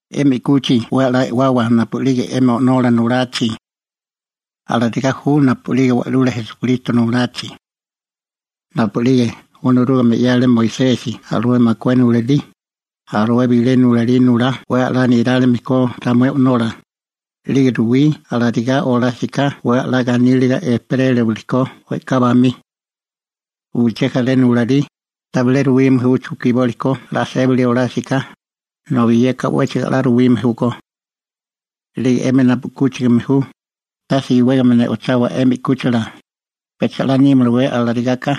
'Emi 'kuchi 'we 'la e'wawa napu'lige 'emi o'nola nulachi. Alarigá ju napu'lige Wa'lula Esukristo nulachi. Napu'lige Onorúgame 'yale Moisesi alué makué nulalí, alué bilé nulalí nulá 'we 'la nirálime ko ramué o'nola, 'lige ruwí alarigá olásiká 'we 'la ganíliga ejperérawili ko we'ká bamí. Uché jaré nulalí, tabilé ruwime ju chukiboli ko 'la sébali olásiká, nobi yeka 'wéchigo 'la ruwime júkó. 'Lige 'emi napu 'kúchigame ju, tase iwégame ne'ochawa 'emi 'kúchila, pecha 'la nímalawé alarigáká,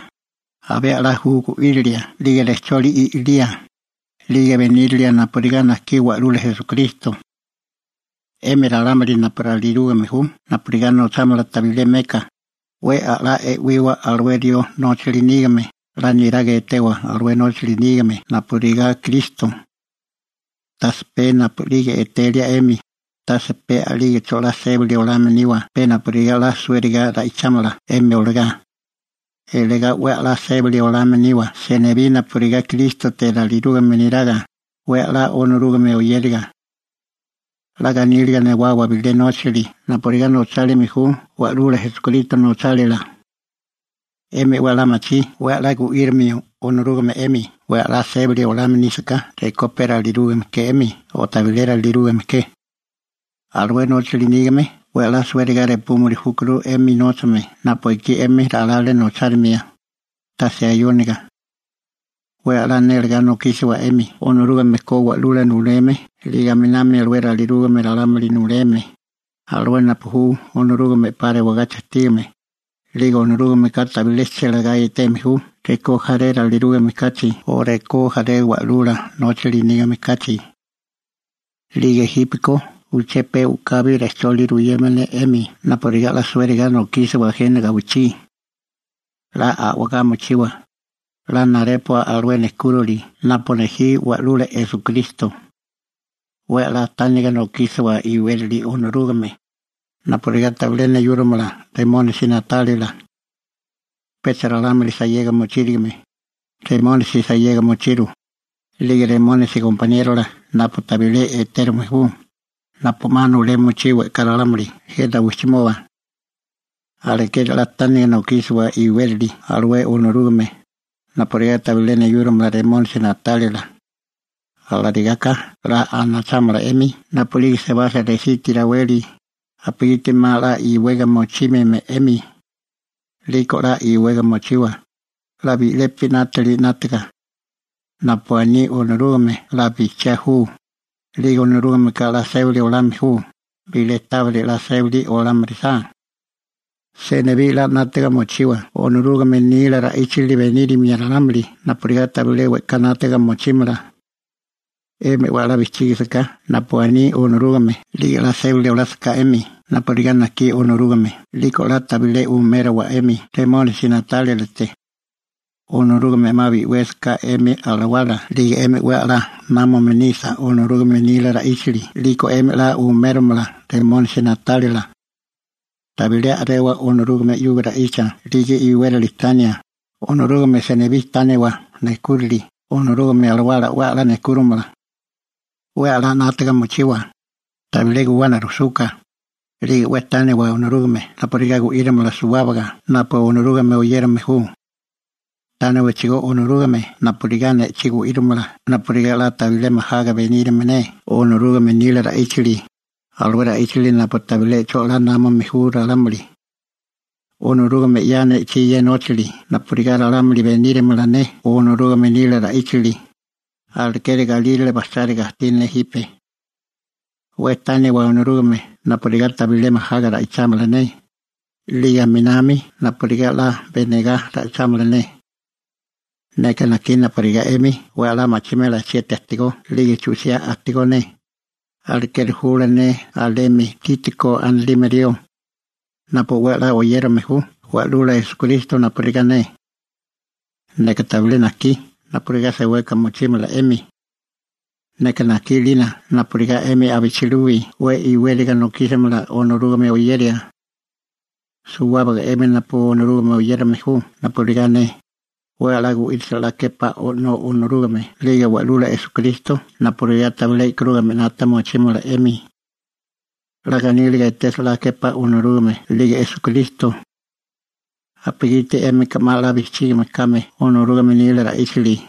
abé 'la ju gu'írilia 'lige rejcholi i'lía, 'lige benírilia napurigá najkí Wa'lula Esukristo. 'Emi ralámuli napu ralirúgame ju napurigá nochámala tabilé meka, 'we 'la e'wiwa alué rió nóchali nígame, 'la niraga etewa alué nóchali nígame napurigá Kristo. Tase pe napu'lige etelia 'emi, tase pe a'lígecho 'la sébali olame niwa pe napurigá 'la suériga ra'ichámala 'emi olagá. Iligá 'we 'la sébali olame niwa senibí napurigá Krístote ralirúgame neraga, 'we 'la Onorúgame oyériga. 'La ganíliga newawa bilé nóchali napurigá nochálime ju Wa'lula Esukristo nochálila. 'Emi 'we 'la machí 'we 'la gu'írimio Onorúgame 'emi 'we 'la sébali olame nísaká rekó pe ralirúgame ke 'emi o tabilé ralirúgame ke. Alué nóchali nígame 'we 'la suériga repúmili júkuru 'emi nóchame napu ekí 'emi ralale nochárimia, tase ayóniga. 'We 'la nélegá nokísiwa 'emi Onorúgame ko wa'lula nuleme 'lige aminami alué ralirúgame ralámuli nuleme, alué napu ju Onorúgame 'pa rewagachi ajtígame, 'lige Onorúgameka tabilé chélegá eteme ju rekó jaré ralirúgame kachi o rekó jaré wa'lula nóchali nígame kachi. 'Lige jípeko uché pe u'kabi rejcholi ruyeme ne 'emi napurigá 'la suériga nokísiwa jena gawichí. 'La a'wagá mochiwa, 'la narépua alué nejkúrali napu nejí Wa'lula Esukristo. 'We 'la tániga nokísiwa iwérali Onorúgame, napurigá tabilé neyúrimala Remónisi na'tálila. Pecha ralámuli sayega mochírigime, Remónisi sayega mochiru, 'lige Remónisi gompaniérola napu tabilé etérume ju, napu 'ma nulea mochí we'ká ralámuli jena wijchimoba. Alekeri 'la tániga nokísiwa iwérali alué Onorúgame, napurigá tabilé neyúrimala Remónisi na'tálila. Alarigaka 'la anachámala 'emi napu'lige sebasa resiti raweli, napugiti 'ma 'la iwega mochímime 'emi. 'Liko 'la iwega mochiwa, 'la bi'lepi 'nátili 'nátaga. Napu aní Onorúgame 'la bijchiá ju, 'lige Onorúgameka 'la sébali olame ju bilé tábiri 'la sébali olame orisá. Senibí 'la 'nátaga mochiwa Onorúgame nila ra'íchali benírimia ralámuli napurigá tabilé we'ká 'nátaga mochímala. 'Emi 'we 'la bijchígisaká napu aní Onorúgame 'lige 'la sébali olásaká 'emi napurigá najkí Onorúgame 'liko 'la tabilé umériwa 'emi Remónisi na'tálilate. Onorúgame 'ma bi'wésaká 'emi alawala 'lige 'emi 'we 'la námame nisa Onorúgame nila ra'íchali 'liko 'emi 'la umérimala Remónisi na'tálila. Tabilé a'rewa Onorúgame 'yuga ra'icha 'lige iwérali tania, Onorúgame senibí tániwa nejkúrali, Onorúgame Alawala 'we la nejkúrimala. 'We 'la 'nátaga mochiwa, tabilé guwana rujsuka, 'lige 'we tániwa Onorúgame napurigá gu'írimala suwábaga napu Onorúgame oyérame ju. Tániwachigó Onorúgame napurigá ne'chí gu'írimala napurigá 'la tabilé majaga benírimala ne Onorúgame nila ra'íchali, alué ra'íchali napu tabilé 'cho 'la námame ju ralámuli. Onorúgame 'ya ne'chí ye nóchali napurigá ralámuli benírima ne Onorúgame nila ra'íchali, alekeri galírale bajcháriga ajtí ne jipe. 'We tániwa Onorúgame napurigá tabilé majaga ra'ichámala ne, 'lige aminami napurigá 'la benagá ra'ichámala ne. Neka najkí napurigá 'emi 'we 'la machimela chieti ajtigó 'lige chu'siá ajtigó ne, alekeri jula ne alemi Tíkiko anilime rió, napu 'we 'la oyérame ju Wa'lula Esukristo napurigá ne. Neka tabilé najkí napurigá seweka mochímala 'emi. Neka najkí 'lina napurigá 'emi abichilubi 'we iwériga nokísimala Onorúgame oyeria. Suwábaga 'emi napu Onorúgame oyérame ju napurigá ne, 'we 'la gu'írasa 'la képá O'nó Onorúgame 'lige Wa'lula Esukristo napurigá tabilé e'karúgamea 'nata mochímala 'emi. 'La ganíliga etesa 'la képá Onorúgame 'lige Esukristo napugiti 'émika 'ma 'la bijchígame kame Onorúgame nila ra'íchali.